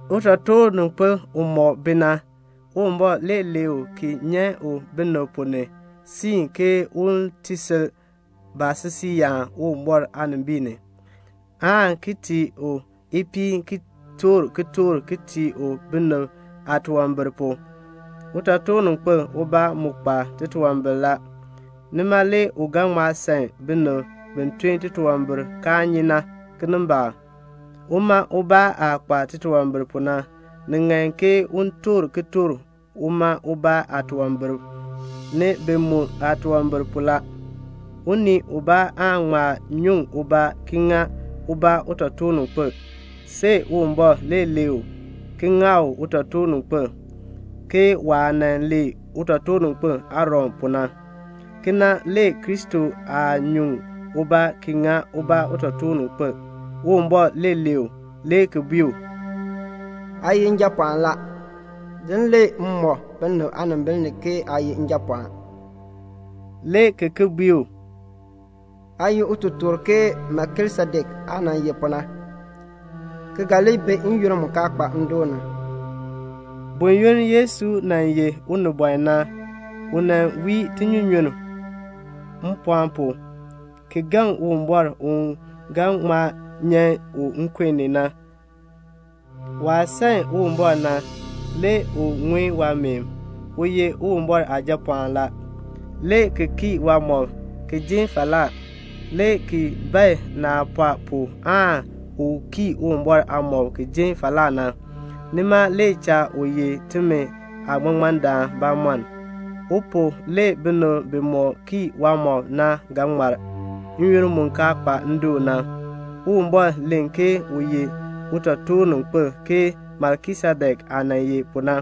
Utotoorninkpil umɔk bi na, Uwumbɔr le lee u ki nyan u binib ponn ni ki siin u, un ti sil baasisiiyaan Uwumbɔr aanimbiin ni, aan ki tii u ipiin ki toor kitork ki tii u binib aatunwambir pu. Utotoorninkpil ubaa mu kpa titunwambir la. Nima le u ga ŋma san binib bi tun titunwambir kaa nyi na, kinimbaak. Uma ubaa aah kpa titunwambir pu na, see u toor kitork uma ubaa aatunwambir pu, ni bi mu aatunwambir pu la. Unii ubaa aan nyuŋ ubaa ki ŋa ubaa utotoorninkpil, see Uwumbɔr le lee u, le ki ŋa u utotoorninkpil, ke waah nan lee utotoorninkpil Aaron pu na. Kena le Kristo aa nyuŋ uma ubaa ki ŋa ubaa utotoorninkpil. Uwumbɔr le lee u, le ki bui u, "Aa ye Njapɔɔn la. Din le m mɔk binib aanimbil ni ke aa ye Njapɔɔn," le ki ki bui u, "Aa ye utotoor ke Melkisedek aah nan ye pu na, ki ga li bi n-yoonn mu kaa kpa ndoon na." Buyoonn Yesu nan ye unibɔn na, u wii tinyunyunn mpɔɔn pu, ki gaŋ Uwumbɔr u ga ŋma nyan u nkun ni na. Waah san Uwumbɔr na, le u ŋun waameen. U ye Uwumbɔr Aajapɔɔn la, le ki kii waamɔb, le ki jin falaa, le ki bae naah pɔɔ pu aan u kii Uwumbɔr aamɔb ki jin falaa na. Nima le cha u ye timi aaŋmaŋmardaan bamɔnn. U pu le binib bimɔk kii waamɔb na ga ŋmar n-yoonn mu kaa kpa ndoon na. Uwumbɔr len ke u ye utotoorninkpil ke Melkisedek aah nan ye pu na.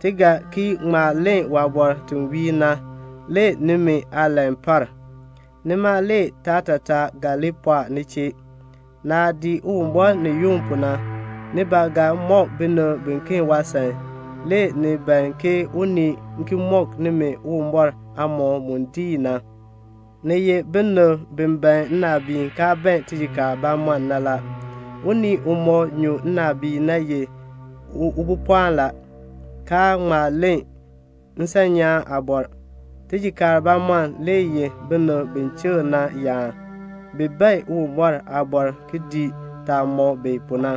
Ti ga ki ŋma len waabɔr ti wiir na. Le nimi aalan par. Nima le taatataa ga li pɔɔ ni chee. Naah dii Uwumbɔr ni yunn pu na, ni ba ga mɔk binib biken waasan. Le ni ban ke unii ki mɔk nimi Uwumbɔr aamɔkm mu diin na. Ni ye binib bi ban nnaabiin kaa ban tijikaar bamɔnn na. Unii umɔk nyu nnaabiin na le ye ubopɔɔn, kaa ŋma len nsanyaan aabɔr. Tijikaar bamɔnn le ye binib bi chikr na yaan. Bi bae Uwumbɔr aaliin ki dii yaa mɔk bi pu na.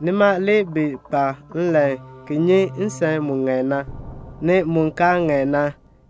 Nima le bi kpa nlan ki bee nsan mu ŋan na, ni mu kaa ŋan na.